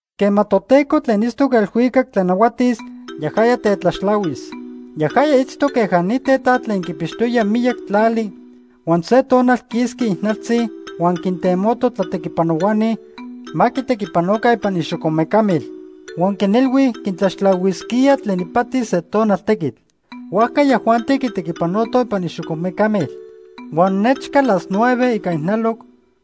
“Quema Toteco tlen itztoc elhuicac tlanahuatis, yajaya tetlaxtlahuis. Yajaya itztoc queja ni tetat tlen quipixtoya miyac tlali huan se tonal quisqui ijnaltzi huan quintemoto tlatequipanohuani ma quitequipanoca ipan ixocomecamil. Huan quinilhui quintlaxtlahuisquía tlen ipati se tonal tequitl. Huajca yajuanti quitequipanotoj ipan ixocomecamil. Huan nechca las nueve ica ijnaloc,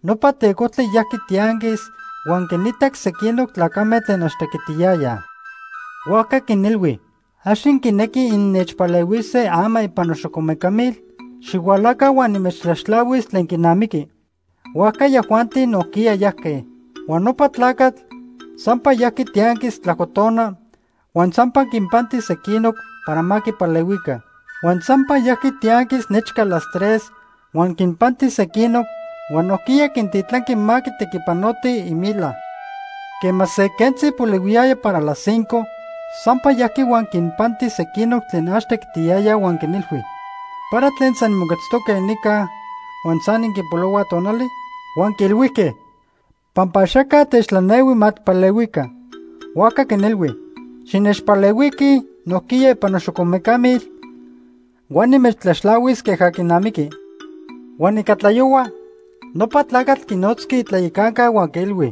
nopa tecojtli yajqui tianquis huan quinitac sequinoc tlacame tlen ax tequitiyayaj. Huajca quinilhui: ‘¿Ax inquinequij innechpalehuise ama ipan noxocomecamil? Xihualaca huan nimechtlaxtlahuis tlen quinamiqui.’ Huajca yajuanti nojquiya yajque. Huan nopa tlacatl sampa yajqui tianquis tlajco tona huan sampa quinpanti sequinoc para ma quipalehuica. Huan sampa yajqui tianquis nechca las tres huan quinpanti sequinoc, huan nojquiya quintitlanqui ma quitequipanotij imila. Quema se quentzi polihuiyaya para las cinco, sampa yajqui huan quinpanti sequinoc tlen ax tequitiyayaj huan quinilhui: ‘¿Para tlen san inmoquetztoque nica huan san inquipolohuaj tonali?’ “Huan quiilhuijque: ‘Pampa axaca techtlanehui ma tijpalehuica.’ “Huajca quinilhui: ‘Xinechpalehuiquij nojquiya ipan noxocomecamil, huan nimechtlaxtlahuis queja quinamiqui.’ “Huan ica tlayohua, nopa tlacatl quinotzqui itlayacanca huan quiilhui: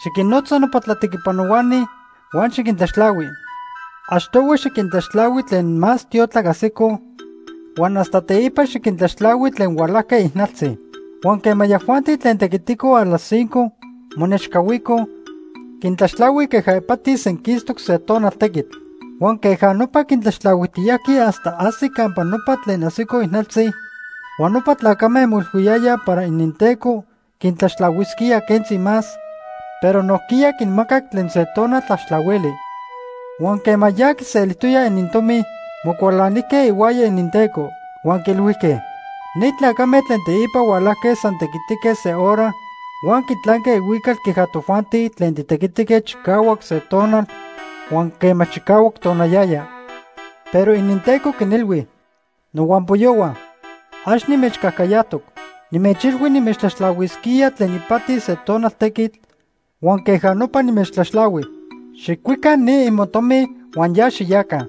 ‘Xiquinnotza nopa tlatequipanohuani huan xiquintlaxtlahui. Achtohui xiquintlaxtlahui tlen más tiotlac ajsicoj, huan hasta teipa xiquintlaxtlahui tlen hualajque ijnaltzi.’ “Huan quema yajuanti tlen tequiticoj a las cinco monechcahuicoj, quintlaxtlahui queja ipati senquistoc se tonal tequitl. Huan queja nopa quintlaxtlahuijtiyajqui hasta ajsic campa nopa tlen ajsicoj ijnaltzi, huan nopa tlacame moilhuiyayaj para ininteco quintlaxtlahuisquía quentzi más, pero nojquiya quinmacac tlen se tonal tlaxtlahuili. Huan quema ya quiselijtoyaj inintomi, mocualanijque ihuaya ininteco. Huan quiilhuijque: ‘Ni tlacame tlen teipa hualajque san tequitique se hora huan quitlanque ihuical queja tojuanti tlen titequitique chicahuac se tonal huan quema chicahuac tonayaya.’ “Pero ininteco quinilhui: ‘Nohuampoyohua, ax nimechcajcayajtoc. Nimechilhui nimechtlaxtlahuisquía tlen ipati se tonal tequitl huan queja nopa nimechtlaxtlahui. Xijcuica ni imotomi huan ya xiyaca.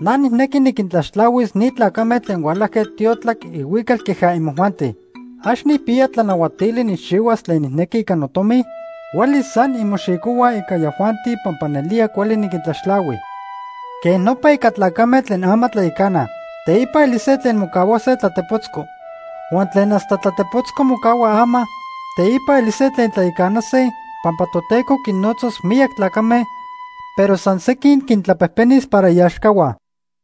Na nijnequi niquintlaxtlahuis ni tlacame tlen hualajque tiotlac ihuical queja imojuanti. ¿Ax nijpiya tlanahuatili nijchihuas tlen nijnequi ica notomi? Huelis san inmoxicohuaj ica yajuanti pampa nelía cuali niquintlaxtlahui.’ “Quej nopa ica tlacame tlen ama tlayacanaj, teipa elise tlen mocahuase tlatepotzco. Huan tlen hasta tlatepotzco mocahuaj ama, teipa elise tlen tlayacanase, pampa Toteco quinnotzas miyac tlacame, pero san sequin quintlapejpenis para iaxcahua.”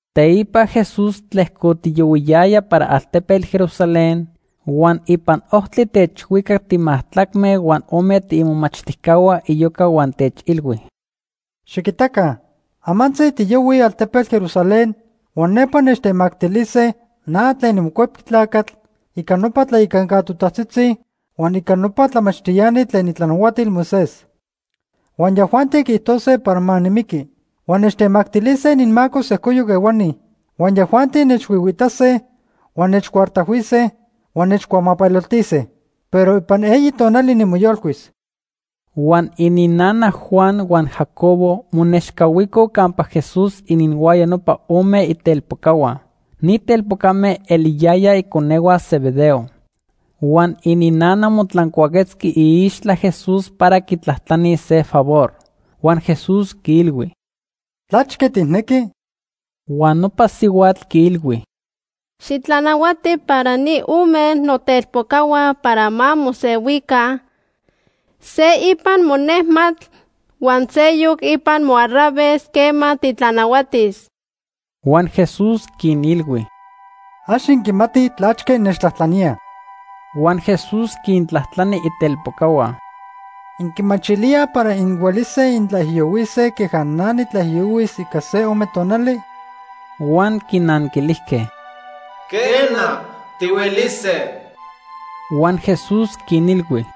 Teipa Jesús tlejcotiyohuiyaya para altepetl Jerusalén, huan ipan ojtli techhuicac timajtlacme huan ome tiimomachtijcahua iyoca huan techilhui: ―Xiquitaca. Amantzi tiyohuij altepetl Jerusalén huan nepa nechtemactilise na tlen niMocuepqui Tlacatl ica nopa tlayacanca totajtzitzi huan ica nopa tlamachtiani tlen itlanahuatil Moisés. Huan yajuanti quiijtose para ma nimiqui. Huan nechtemactilise ininmaco sejcoyoc ehuani. Huan yajuanti nechhuihuiitase, huan nechcuartajhuise huan nechcuamapeloltise. Pero ipan eyi tonali nimoyolcuis. Huan ininnana Juan huan Jacobo monechcahuico campa Jesús ininhuaya nopa ome itelpocahua. Ni telpocame eliyayaj iconehua Zebedeo. Huan ininnana motlancuaquetzqui iixtla Jesús para quitlajtlanilis se favor. Huan Jesús quiilhui: ―¿Tlachque tijnequi? Huan nopa sihuatl quiilhui: ―Xitlanahuati para ni ome notelpocahua para ma mosehuica, se ipan monejmatl huan seyoc ipan moarraves quema titlanahuatis. Huan Jesús quinilhui: ―Ax inquimatij tlachque innechtlajtlaníaj. Huan Jesús quintlajtlani itelpocahua: ―¿Inquimachilíaj para inhuelise intlaijiyohuise queja na nitlaijiyohuis ica se ome tonali? Huan quinanquilijque: ―Quena, tihuelise. Huan Jesús quinilhui: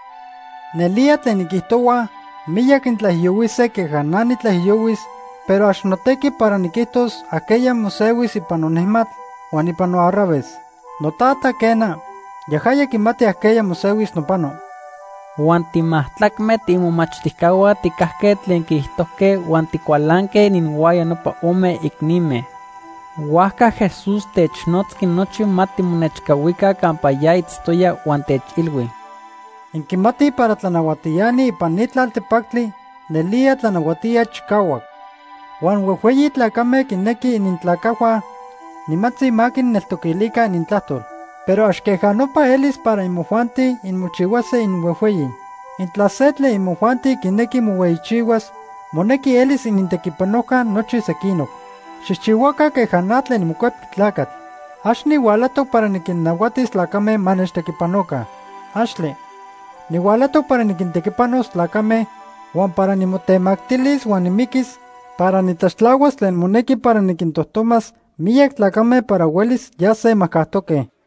―Nelía tlen inquiijtohuaj, miyac intlaijiyohuise queja na nitlaijiyohuis, pero ax notequi para niquijtos ajqueya mosehuis ipan nonejmatl huan ipan noarraves. NoTata, quena, yajaya quimati ajqueya mosehuis nopano. Huan timajtlacme tiimomachtijcahua tijcajque tlen quiijtojque huan ticualanque ininhuaya nopa ome icnime. Huajca Jesús technotzqui nochi ma timonechcahuica campa ya itztoya huan techilhui: ―Inquimatij para tlanahuatiani ipan ni tlaltepactli nelía tlanahuatíaj chicahuac. Huan huejhueyi tlacame quinequij inintlacajhua nimantzi ma quinneltoquilica inintlajtol. Pero ax queja nopa elis para imojuanti inmochihuase inhuejhueyi. Intla se tlen imojuanti quinequi mohueyichihuas, monequi elis inintequipanojca nochi sequinoc. Xijchihuaca queja na tlen niMocuepqui Tlacatl. Ax nihualajtoc para niquinnahuatis tlacame ma nechtequipanoca. ¡Axtle! Nihualajtoc para niquintequipanos tlacame, huan para nimotemactilis huan nimiquis para nitlaxtlahuas tlen monequi para niquintojtomas miyac tlacame para huelis yase majcajtoque.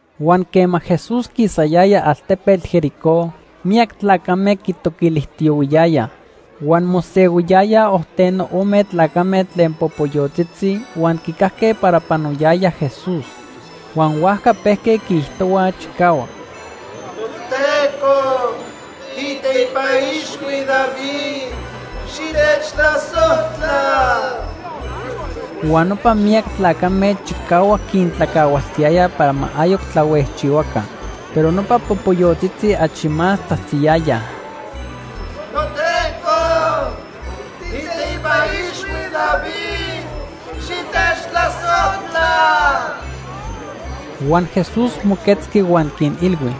Huan quema Jesús quisayaya altepetl Jericó, miyac tlacame quitoquilijtiyohuiyayaj. Huan mosehuiyayaj ojteno ome tlacame tlen popoyotzitzi huan quicajque para panoyaya Jesús. Huan huajca pejque quiijtohuaj chicahuac: ―¡Toteco, tiiteipa ixhui David, xitechtlasojtla! Huan nopa miyac tlacame chicahuac quintlacahualtiyayaj para ma ayoc tlahuejchihuaca. Pero nopa popoyotzitzi achi más tzajtziyayaj: ―¡Toteco, tiiteipa ixhui David, xitechtlasojtla! Huan Jesús moquetzqui huan quinilhui: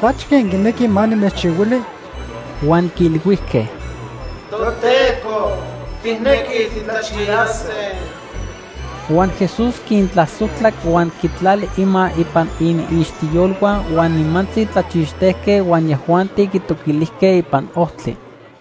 ―¿Tlachque inquinequij ma nimechchihuili? Huan quiilhuijque: ―Toteco, tijnequij titlachiyase. Huan Jesús quintlasojtlac huan quitlali ima ipan iniixtiyolhua huan nimantzi tlachixtejque huan yajuanti quitoquilijque ipan ojtli.